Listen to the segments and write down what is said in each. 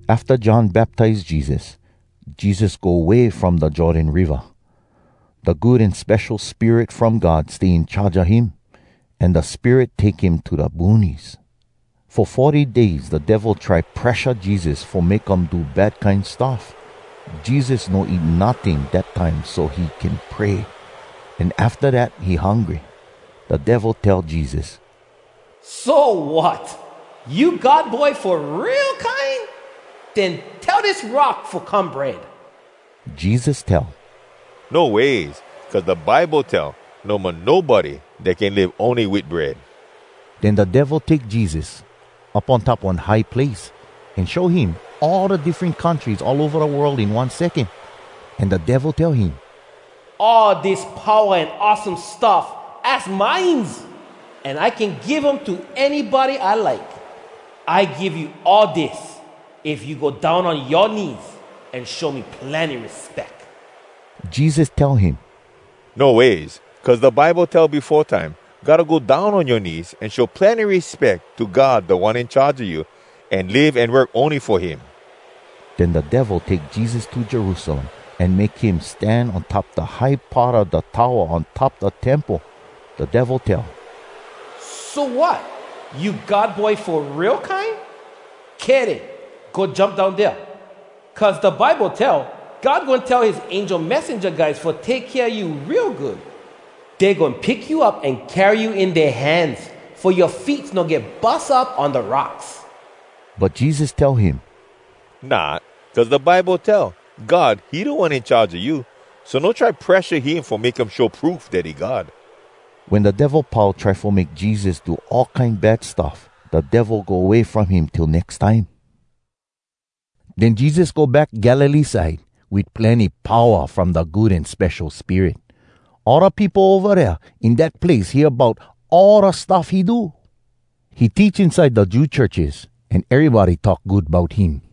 Afta John baptize Jesus, Jesus go way from da Jordan Riva. Da Good An Spesho Spirit from God stay in charge a him, an da Spirit take him to da boonies. Fo forty days da Devil try presha Jesus fo make um do bad kine stuff. Jesus no eat notting dat time so he can pray, an afta dat he hungry. Da Devil tell Jesus, “So, wat? You God Boy fo real kine? Den tell dis rock fo come bread.” Jesus tell, “No ways! Cuz da Bible tell, ‘No mo nobody dat can live ony wit bread.’” Den da Devil take Jesus up on top one high place, an show him all da diffren countries all ova da world in one secon. An da Devil tell him, “All dis powa an awesome stuff, az mines, an I can give um to anybody I like. I give you all dis, if you go down on yoa knees an show me plenny respeck.” Jesus tell him, “No ways! Cuz da Bible tell befo time, “‘Gotta go down on yoa knees An show plenny respeck to God Da One In Charge a you, An live an work ony fo him.’” Den da Devil take Jesus to Jerusalem an make him stan on top da high part a da towa on top da Temple. Da Devil tell, “So, wat? You God Boy fo real kine? Kay den, go jump down dea. Cuz da Bible tell, “‘God goin tell his angel messenja guys Fo take kea you real good. Dey goin pick you up an carry you in dea hands, Fo yoa feets no get bus up on da rocks.’” But Jesus tell him, “Not! Cuz da Bible tell, ‘God, he Da One In Charge a you. So no try presha him fo make him show proof dat he God.’” Wen da Devil pau try fo make Jesus do all kine bad stuff, da Devil go way from him till nex time. Den Jesus go back Galilee side, wit plenny powa from da Good An Spesho Spirit. All da peopo ova dea in dat place hear bout all da stuff he do. He teach inside da Jew churches, an erybody talk good bout him.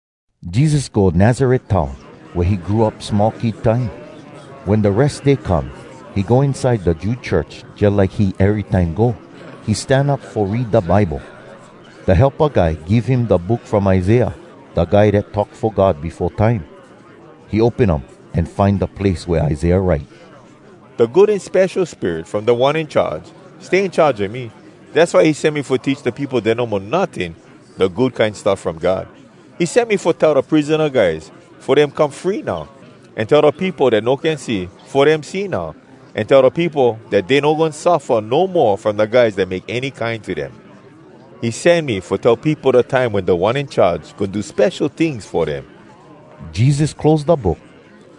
Jesus go Nazaret town, wea he grow up small kid time. Wen da Res Day come, he go inside da Jew church, jalike he erytime go. He stan up fo read da Bible. Da helpa guy give him da book from Isaiah, da guy dat talk fo God befo time. He open um an find da place wea Isaiah write, “Da Good An Spesho Spirit from Da One In Charge stay in charge a me, Dass why he sen me fo teach da peopo dat no mo notting Da Good Kine Stuff From God. He sen me fo tell da prisona guys Fo dem come free now. An tell da peopo dat no can see, Fo dem see now, An tell da peopo Dat dey no goin suffa no mo From da guys dat make any kine to dem, He sen me fo tell peopo da time Wen Da One In Charge Goin do spesho tings fo dem.” Jesus close da book,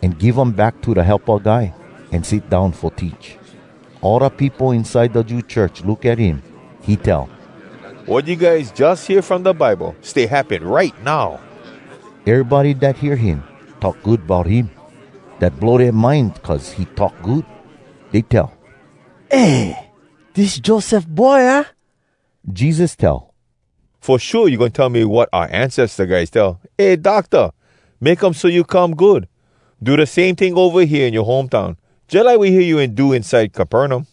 an give um back to da helpa guy, an sit down fo teach. All da peopo inside da Jew church look at him. He tell, “Wat you guys jus hear from da Bible, stay happen right now!” Erybody dat hear him talk good bout him. Dat blow dea mind cuz he talk good. Dey tell, “Eh, dis Joseph boy, aah?” Jesus tell, “Fo shua you goin tell me wat oua ancesta guys tell, ‘Eh Docta! Make um so you come good! Do da same ting ova hea in yoa home town, jalike we hear you wen do inside Capernaum.’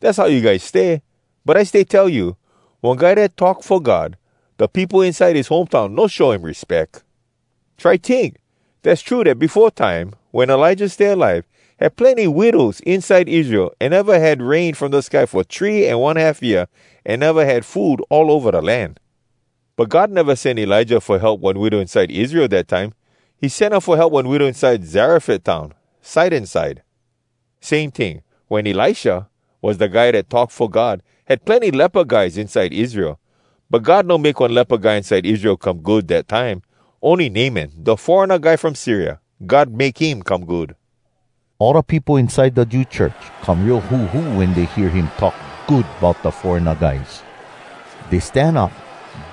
Dass how you guys stay! But I stay tell you, ‘One guy dat talk fo God, da peopo inside his home town no show him respeck.’ Try tink! Dass true dat befo time, wen Elijah stay alive, had plenny widows inside Israel an neva had rain from da sky fo three an one half year, an neva had food all ova da land. But God neva sen Elijah fo help one widow inside Israel dat time. He sen um fo help one widow inside Zarefat town, Sidon side. Same ting, wen Elisha was da guy dat talk fo God, had plenny lepa guys inside Israel. But God no make one lepa guy inside Israel come good, dat time. Ony Naaman, da foreigna guy from Syria, God make him come good.” All da peopo inside da Jew church come real huhu wen dey hear him talk good bout da foreigna guys. Dey stan up,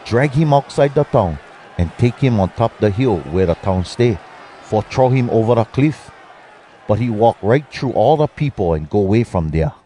drag him outside da town, an take him on top da hill wea da town stay, fo throw him ova da cliff. But he walk right thru all da peopo an go way from dea.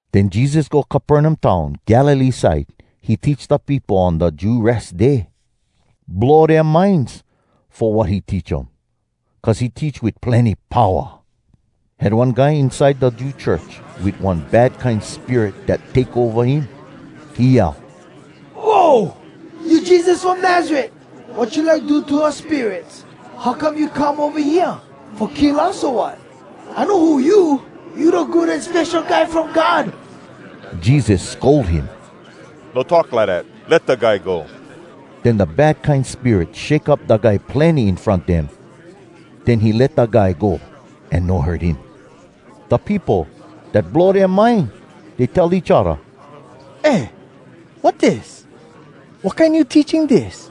Den Jesus go Capernaum town, Galilee side. He teach da peopo on da Jew Res Day. Blow dea minds, fo wat he teach um. Cuz he teach wit plenny powa. Had one guy inside da Jew church wit one bad kine spirit dat take ova him. He yell, “Whoa! You Jesus from Nazaret! Wat you like do to us spirits? How come you come ova hea? Fo kill us, o wat? I know who you! You da Good an Spesho Guy from God!” Jesus scold him. “No talk lidat! Let da guy go!” Den da bad kine spirit shake up da guy plenny in front dem, den he let da guy go, an no hurt him. Da peopo, dat blow dea mind. Dey tell each odda, “Eh! Wat dis? Wat kine new teaching dis?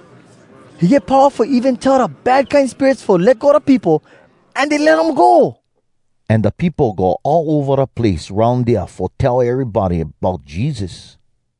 He get powa fo even tell da bad kine spirits fo let go da peopo, an dey let um go!” An da peopo go all ova da place aroun dea fo tell erybody bout Jesus.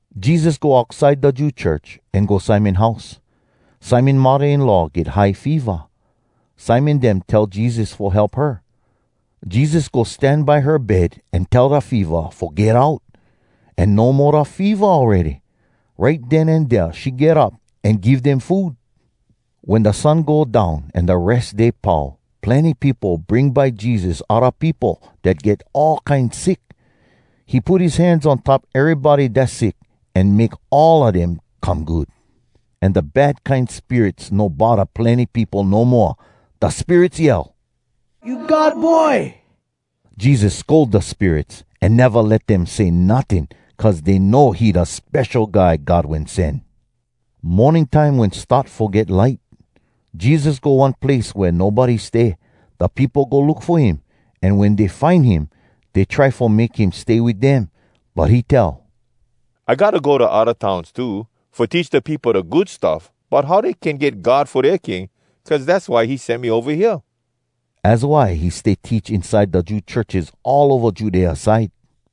Jesus go outside da Jew church, an go Simon house. Simon muddah-in-law get high feva. Simon dem tell Jesus fo help her. Jesus go stan by her bed an tell da feva fo get out. An no mo da feva awready. Right den an dea she get up, an give dem food. Wen da sun go down an da Res Day pau, plenny peopo bring by Jesus odda peopo dat get all kine sick. He put his hands on top erybody dass sick, an make all a dem come good. An da bad kine spirits no bodda plenny peopo no moa. Da spirits yell, “You God Boy!” Jesus scold da spirits, an neva let dem say notting, cuz dey know he da Spesho Guy God Wen Sen. Morning time wen start fo get light, Jesus go one place wea nobody stay. Da peopo go look fo him, an wen dey find him, dey try fo make him stay wit dem. But he tell, “I gotta go da odda towns too, fo teach da peopo da Good Stuff bout how dey can get God fo dea king, cuz dass why he sen me ova hea.” Az why he stay teach inside da Jew churches all ova Judea side.